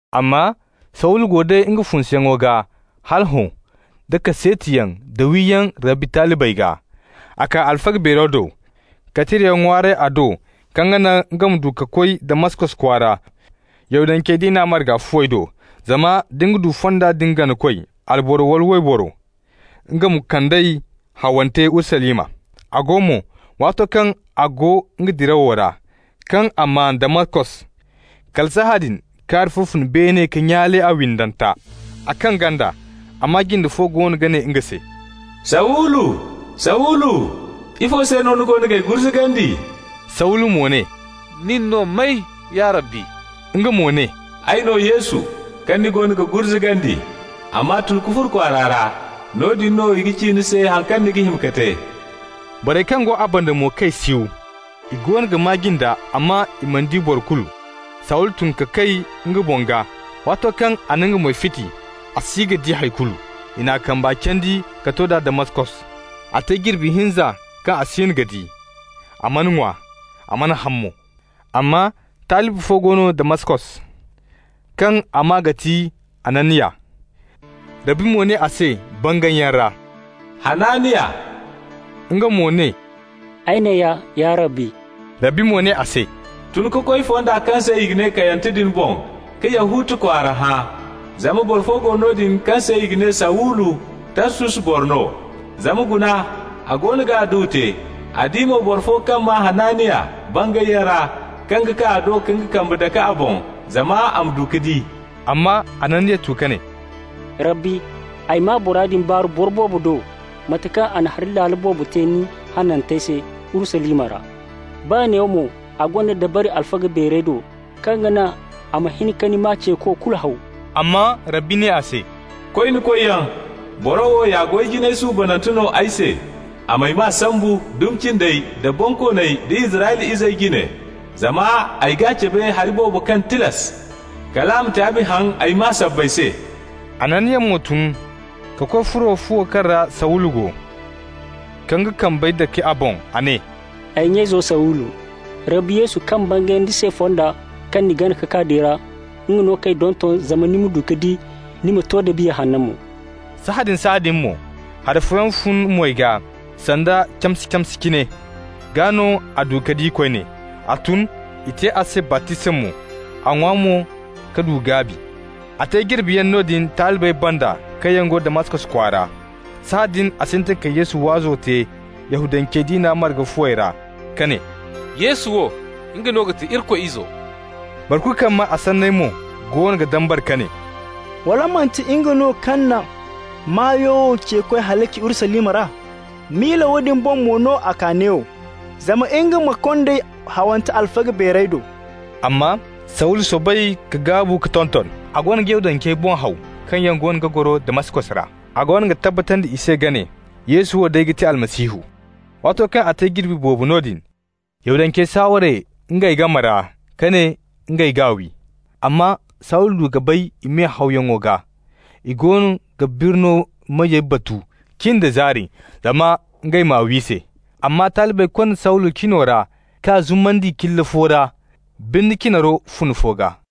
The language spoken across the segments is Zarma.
Amma Sawulu go day nga funsuyaŋo gaa hala hõ da kaseetiyaŋ da wiyaŋ Rabbi talibey gaa. A kaa alfaga beero do ka tirayaŋ ŋwaaray a do kaŋ ga naŋ nga ma du ka koy Damaskos kwaara Yahudance diina marga fuwey do, zama da nga du Fonda din ganakoy, alboro wala wayboro, nga ma kand'ey hawante Urusalima. A go mo, waato kaŋ a go nga dirawo ra, kaŋ a maan Damaskos, kala sahãadin kaari fo fun beene ka nyaale a windanta. A kaŋ ganda, a maa jinde fo goono ga ne nga se: «Sawulu! Sawulu! Ifo se no ni goono g'ay gurzugandi?» Sawulu mo ne: «Nin no may, ya Rabbi?» Nga mo ne: «Ay no Yesu, kaŋ ni goono ga gurzugandi. Amma tun ka furo kwaara ra. Noodin no i ga ci ni se haŋ kaŋ ni ga hima ka te.» Borey kaŋ go a banda mo kay siw! I goono ga maa jinda, amma i mana di boro kulu. Sawulu tun ka kay nga boŋ gaa. Waato kaŋ a na nga moy fiti, a si ga di hay kulu. I n'a kamba candi ka to d'a Damaskos. A te jirbi hinza kaŋ a siino ga di, a mana ŋwa, a mana haŋ mo. Amma talibi fo go no Damaskos, kaŋ a maa ga ti Hananiya. Rabbi mo ne a se bangayyaŋ ra: «Hananiya!» Nga mo ne: «Ay neeya, ya Rabbi.» Rabbi mo ne a se: «Tun ka koy fonda kaŋ se i ga ne Kayante din boŋ ka Yahuta kwaara hã. Zama boro fo go noodin kaŋ se i ga ne Sawulu, Tarsus boro no. Zama guna, a goono ga adduwa te, a di mo boro fo kaŋ maa Hananiya bangayyaŋ ra kaŋ ga kaa a do ka nga kambey dake a boŋ, zama a ma du ka di.» Amma Hananiya tu ka ne: «Rabbi, ay maa bora din baaru boro boobo do, mate kaŋ a na hari laalo boobo te ni hanantey se Urusalima ra. Baa neewo mo, a gonda dabari alfaga beerey do, kaŋ ga naŋ a ma hin ka ni maa ceeko kulu haw.» Amma Rabbi ne a se: «Koy ni koyyaŋ. Boro wo ya goy jinay suubanante no ay se, a m'ay maa sambu dumi cindey da bonkooney da Israyla izey jine. Zama ay g'a cabe hari boobo kaŋ tilas kal a ma taabi haŋ ay maa sabbay se.» Hananiya mo tun ka koy furo fuwo kaŋ ra Sawulu go, ka nga kambey dake a boŋ. A ne: «Ay nya-izo Sawulu, Rabbi Yesu kaŋ bangay ni se fonda kaŋ ni gana ka kaa din ra, nga no k'ay donton zama ni ma du ka di, ni ma to da Biya Hanno mo.» Sahãadin-sahãadin mo, hari fooyaŋ fun moy gaa sanda camse-camse cine. Gaa no a du ka di koyne. A tun, i te a se baptisma mo. A ŋwa mo ka du gaabi. A te jirbiyaŋ noodin talibey banda kaŋ yaŋ go Damaskos kwaara. Sahãadin a sintin ka Yesu waazo te Yahudance diina marga fuwey ra ka ne: «Yesu wo, nga no ga ti Irikoy Izo no.» Boro kulu kaŋ maa a sanney mo goono ga dambara ka ne: «Wala manti nga no kaŋ na maa wo ceekoy halaci Urusalima ra? Miila woodin boŋ mo no a kaa neewo, zama nga ma kond'ey hawante alfaga beerey do.» Amma Sawulu soobay ka gaabu ka tonton. A goono ga Yahudancey boŋ haw kaŋ yaŋ goono ga goro Damaskos ra. A goono ga tabbatandi i se ka ne: «Yesu wo day ga ti Almasihu.» Waato kaŋ a te jirbi boobo noodin, Yahudancey saaware ngey game ra ka ne ngey g'a wi. Amma Sawulu du ka bay i me-hawyaŋo gaa. I goono ga birno meyey batu cin da zaari zama ngey m'a wi se. Amma talibey konda Sawulu cino ra k'a zumandi cilla fo ra birni cinaro fune fo gaa.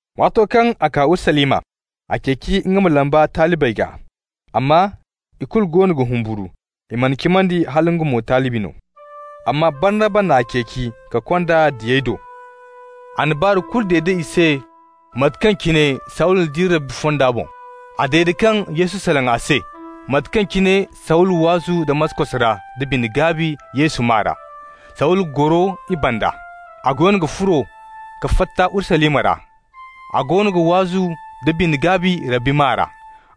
Waato kaŋ a kaa Urusalima, a ceeci nga ma lamba talibey gaa, amma i kulu goono ga humburu. I mana cimandi hala nga mo talibi no. Amma Barnaba n'a ceeci ka kond'a diyey do. A na baaru kulu dede i se mate kaŋ cine Sawulu di Rabbi fonda boŋ, a dede kaŋ Yesu salaŋ a se, da mate kaŋ cine Sawulu waazu Damaskos ra da bine-gaabi Yesu maa ra. Sawulu goro i banda. A goono ga furo ka fatta Urusalima ra. A goono ga waazu da bine-gaabi Rabbi maa ra.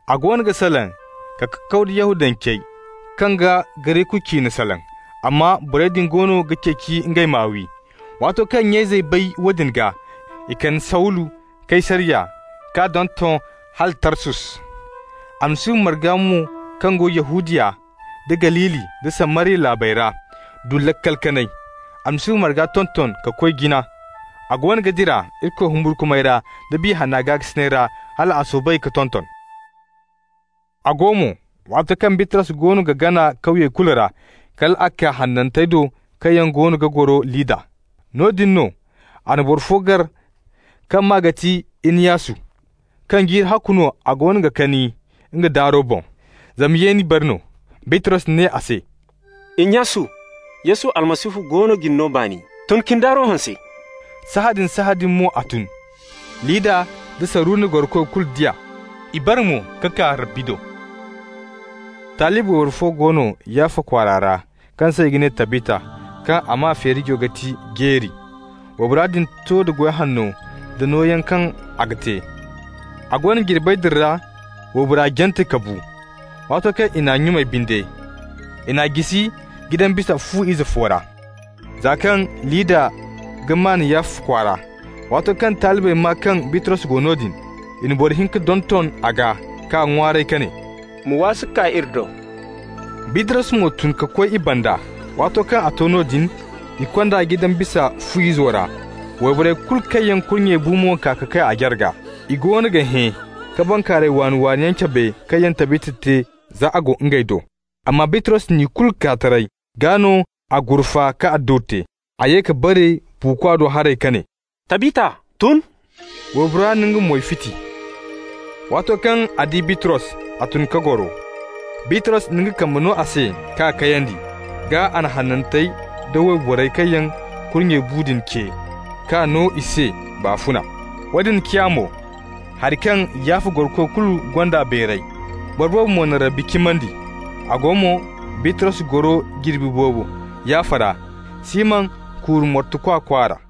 A goono ga salaŋ ka kakaw da Yahudancey kaŋ ga Gareku ciine salaŋ, amma borey din goono ga ceeci ngey m'a wi. Waato kaŋ nya-izey bay woodin gaa, i kande Sawulu Kaysariya k'a donton hala Tarsus. Almasihu marga mo kaŋ go Yahudiya nda Galili nda Samariya laabey ra du laakal kanay. Almasihu marga tonton ka koy jina. A goono ga dira Irikoy humburkumay ra da Biya Hanna gaakasinay ra hal a soobay ka tonton. A go mo, waato kaŋ Bitros goono ga gana kawyey kulu ra, kal a kaa hanantey do kaŋ yaŋ goono ga goro Lidda. Noodin no a na boro fo gar kaŋ maa ga ti Inyasu, kaŋ jiiri ahakku no a goono ga kani nga daaro boŋ, zama yeeni bari no. Bitros ne a se: «Inyasu, Yesu Almasihu goono ga ni no baani. Tun ka ni daaro hanse.» Sahãadin-sahãadin mo a tun. Lidda nda Saruna gorokoy kulu di a, i bare mo ka kaa Rabbi do. Talibi wayboro fo go no Yaffa kwaara ra, kaŋ se i ga ne Tabita, kaŋ a maa feerijo ga ti Jeeri. Waybora din to da goy hanno da nooyaŋey kaŋ a ga te. A go no, jirbey din ra waybora jante ka bu. Waato kaŋ i n'a nyumay binde, i n'a jisi jidan bisa fu-ize fo ra. Za kaŋ Lidda ga maan Yaffa kwaara, waato kaŋ talibey maa kaŋ Bitros go noodin, i na boro hinka donton a gaa k'a ŋwaaray ka ne: «Ma waasu ka kaa iri do.» Bitros mo tun ka koy i banda. Waato kaŋ a to noodin, i kond'a jidan bisa fu-izo ra. Wayborey kulu kaŋ yaŋ kurnye bu mo kaa ka kay a jarga. I goono ga hẽ ka bankaaray waani-waani yaŋ cabe kaŋ yaŋ Tabita te za a go ngey do. Amma Bitros n'i kulu kaa taray, gaa no a gurfa ka adduwa te. A ye ka bare buukwa do haray ka ne: «Tabita, tun!» Waybora na nga moy fiti. Waato kaŋ a di Bitros, a tun ka goro. Bitros na nga kambe no a se k'a kayandi. Gaa a na hanantey da wayborey kaŋ yaŋ kurnye bu din ce, k'a no i se baafuna. Woone ciya mo hari kaŋ Yaffa gorokoy kulu gond'a bayray. Boro boobo mo na Rabbi cimandi. A go mo, Bitros goro jirbi boobo Yaffa ra, Siman kuuru mortukwa kwaara.